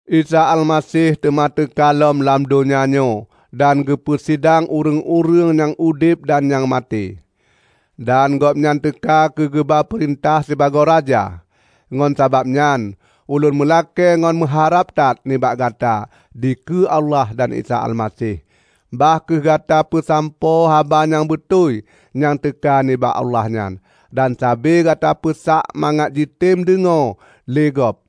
Isa Almaseh teuma teuka lom lam donya nyoe dan geupeu sidang ureuëng-ureuëng nyang udeb dan nyang maté; dan Gobnyan teuka keugeuba peurintah sibagoe Raja. Ngon sabab nyan ulôn meulakée ngon meuharab that nibak gata dikeue Allah dan Isa Almaseh: Bah kheueh gata peusampoe haba nyang beutôi nyang teuka nibak Allah nyan, dan sabe gata peusak mangat jitem deungoe lé gob,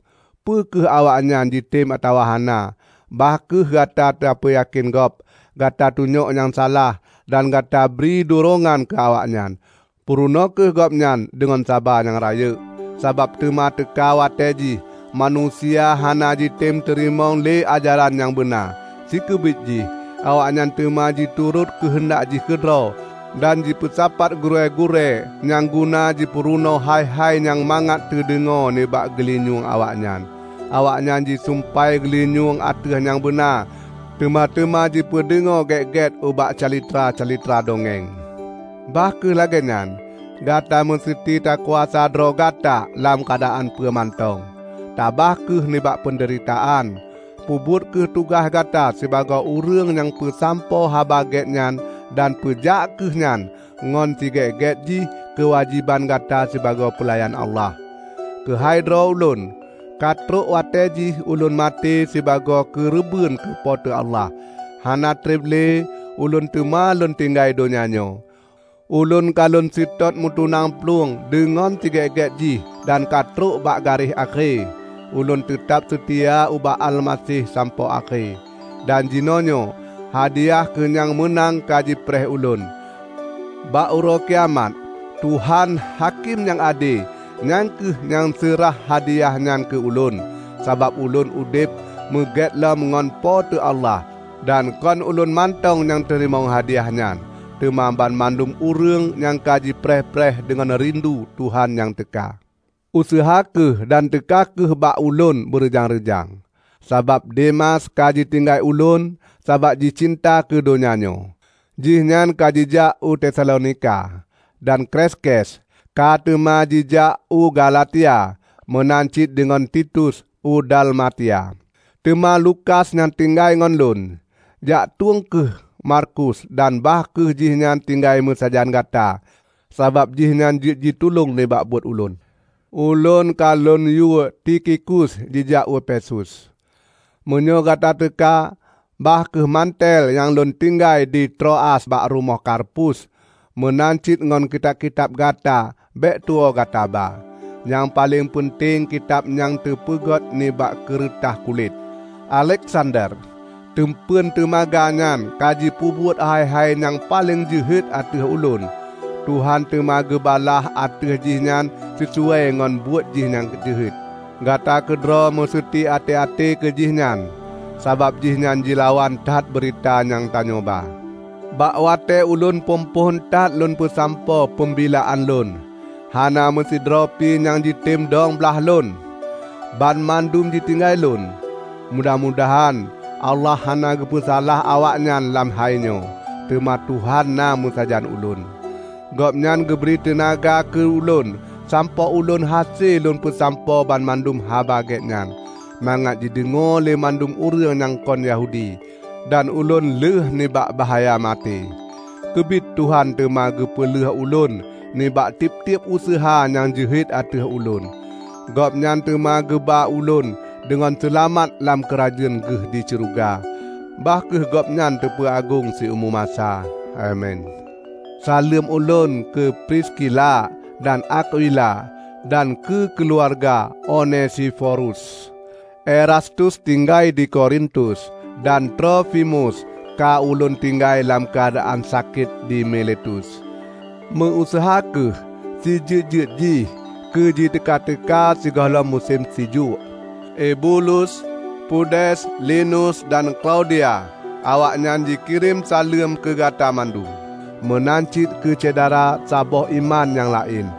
peu kheueh awaknyan jitem atawa hana. Bah kheueh gata tapeuyakén gob, gata tunyok nyang salah, dan gata bri durongan keu awaknyan. Peurunoe kheueh gob nyan deungon saba nyang rayeuk. Sabab teuma teuka watée jih, manusia hana jitem teurimong lé ajaran nyang beuna. Sikeubiet jih, awaknyan teuma jiturot keuheundak jih keudroe, dan jipeusapat gurée-gurée nyang guna jipeurunoe hai-hai nyang mangat teudeungoe nibak geulinyueng awaknyan. Awaknyan jisumpai geulinyueng ateueh nyang beuna, teuma teuma jipeudeungoe gét-gét ubak calitra-calitra dongeng. Bah kheueh lagée nyan, gata meuseuti takuasa droe gata lam keuadaan peue mantong. Tabah kheueh nibak peundeuritaan, peubuet kheueh tugaih gata sibagoe ureuëng nyang peusampoe Haba Gét nyan dan peujak kheueh nyan ngon sigét-gét jih keuwajéban gata sibagoe peulayan Allah. Keuhai droe ulôn, ka trok watée jih ulôn maté sibagoe keureubeuen keu Po teu Allah. Hana treb lé ulôn teuma lôn tinggai donya nyoe. Ulôn ka lôn seutôt meutunang plueng deungon sigét-gét jih, dan ka trob bak garéh akhé. Ulôn teutab seutia ubak Almaseh sampoe akhé. Dan jinoenyoe hadiah keu nyang meunang ka jipreh ulôn. Bak Uroe Kiamat, Tuhan, Hakém nyang ade nyan kheueh nyang seurah hadiah nyan keu ulôn, sabab ulôn udeb meugét lom ngon Po teu Allah. Dan kon ulôn mantong nyang teurimong hadiyah nyan, teuma banmandum ureuëng nyang ka jipreh-preh deungon rindu Tuhan nyang teuka. Useuha kheueh dan teuka kheueh bak ulôn beureujang-reujang, sabab Demas ka jitinggai ulôn sabab jicinta keu donya nyoe. Jihnyan ka jijak u Tesalonika. Dan Kreskes ka teuma jijak u Galatia, meunan cit deungon Titus u Dalmatia. Teuma Lukas nyang tinggai ngon lôn. Jaktueng kheueh Markus dan bah kheueh jihnyan tinggai meusajan gata, sabab jihnyan jeuet jitulông nibak buet ulôn. Ulôn ka lôn yue Tikhikus jijak u Efesus. Meunyoe gata teuka, ba kheueh mantel nyang lôn tinggai di Troas bak rumoh Karpus. Meunan cit ngon kitab-kitab gata bék tuwoe gata ba, nyang paleng peunteng kitab nyang teupeugét nibak keureutah kulét. Aleksander, teumpeun teumaga nyan ka jipeubuet hai-hai nyang paleng jeuhet ateueh ulôn. Tuhan teuma geubalaih ateueh jih nyan sisuai ngon buet jih nyang jeuhet. Gata keudroe meuseuti até-até keu jih nyan, sabab jihnyan jilawan that beurita nyang tanyoe ba. Bak watée ulôn phon-phon that lôn peusampoe peumbilaan lôn, hana meusidroe pi nyang jitem dong blaih lôn; banmandum jitinggai lôn. Mudah-mudahan Allah hana geupeusalah awaknyan lam hainyoe! Teuma Tuhan na meusajan ulôn. Gobnyan geubri teunaga keu ulôn sampoe ulôn hase lôn peusampoe banmandum Haba Gét nyan, mangat jideungoe lé mandum ureuëng nyang kon Yahudi. Dan ulôn lheuh nibak bahya maté. Keubiet Tuhan teuma geupeulheuh ulôn nibak tieb-tieb useuha nyang jeuhet ateueh ulôn. Gobnyan teuma geuba ulôn deungon seulamat lam keurajeuen Geuh di Syeuruga. Bah kheueh Gobnyan teupeuagong siumu masa! Amin. Saleuem ulôn keu Priskila dan Akwila dan keu keuluwarga Onesiforus. Erastus tinggai di Korintus, dan Trofimus ka ulôn tinggai lam keuadaan sakét di Miletus. Meu-useuha kheueh sijeuet-jeuet jih keuteu-teuka sigohlom musem sijuek. Ebulus, Pudes, Linus, dan Klaudia, awaknyan jikirém saleuem keugata mandum; meunan cit keu syedara saboh iman nyang laén.